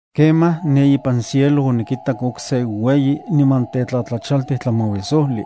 Kemaj, ne ipan cielo onikitak okse ueyi niman tetlatlachaltij tlamauisojli.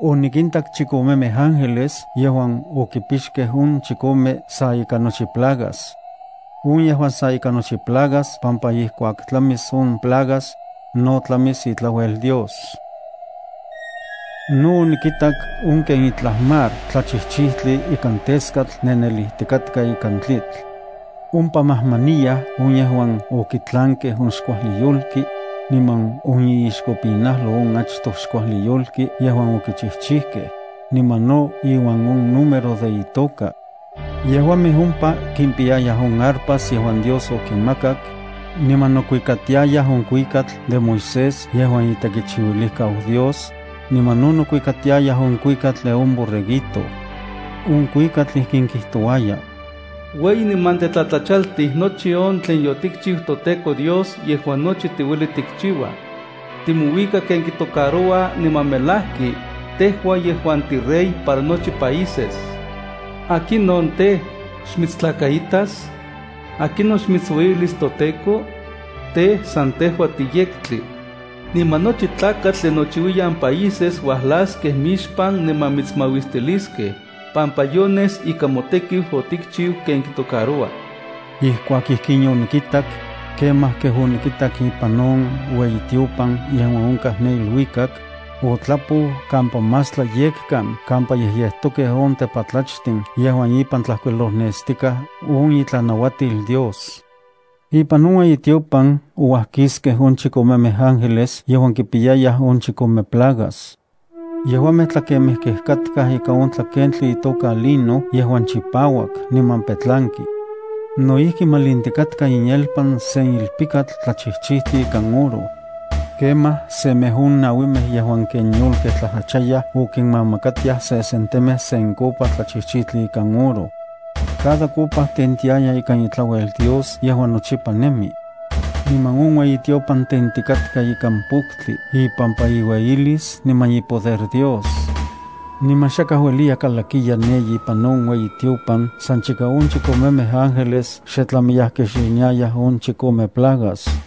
Onikintak chikomemej ángeles yejuan okipixkej on chikome sa ika nochi plagas. On yejua sa ika nochi plagas pampa ijkuak tlamis on plagas, no tlamis itlauel Dios. No onikitak on ken itlaj mar tlachijchijtli ikan teskatl nenelijtikatka ikan tlitl. Ompa majmaniyaj on yejuan okitlankej on xkuajli yolki, niman on iixkopinajlo on achtoj xkuajli yolki yejuan okichijchijkej, niman no iuan on número de itoka. Yejuamej ompa kimpiyayaj on arpas yejuan Dios okinmakak, niman nokuikatiayaj on kuikatl de Moisés yejuan itekichiuilijkau Dios, niman no nokuikatiayaj on kuikatl de on Borreguito. On kuikatl ijkin kijtouaya: Ueyi niman tetlatlachaltij nochi on tlen yotikchiu toTEKO Dios yejuan nochi tiueli tikchiua. Timouika ken kitocaroua, niman melajki, tejua yejuan tiRey para nochi países. ¿Akinon tej, xmitstlakaitas? ¿Akinon xmitsueyilis toTEKO? Tej, san tejua tiyektli. Niman nochi tlakatl de nochiuiyan países uajlaskej mixpan niman mitsmauistiliskej, pampa yones ika motekiu otikchiu ken kitocaroua. Ijkuak ijkin yonikitak, kemaj kej onikitak ipan on ueyitiopan yejuan onkaj ne iluikak, otlapou kampa más tlayekkan kampa yejyejtokej on tepatlachtin yejuan ipan tlajkuilolnestikaj on itlanauatil Dios. Ipan on ueyitiopan ouajkiskej on chikomemej ángeles yejuan kipiyayaj on chikome plagas. Yejuamej tlakemejkej katkaj ika on tlakentli itoka lino yejuan chipauak niman petlanki. No ijki malintikatka inyelpan sen ilpikatl tlachijchijtli ikan oro. Kemaj semej on nauimej yejuan ken yolkej tlajtlachayaj okinmamakatiaj sesentemej sen copa tlachijchijtli ikan oro. Cada copa tentiaya ika itlauel Dios yejuan nochipa nemi. Niman on ueyitiopan tentikatka ikan poktli ipampa iueyilis niman ipoder Dios. Niman xakaj ueliya kalakiya ne ipan on ueyitiopan san chika on chikomemej ángeles xe tlamiyaj kixiniayaj on chikome plagas.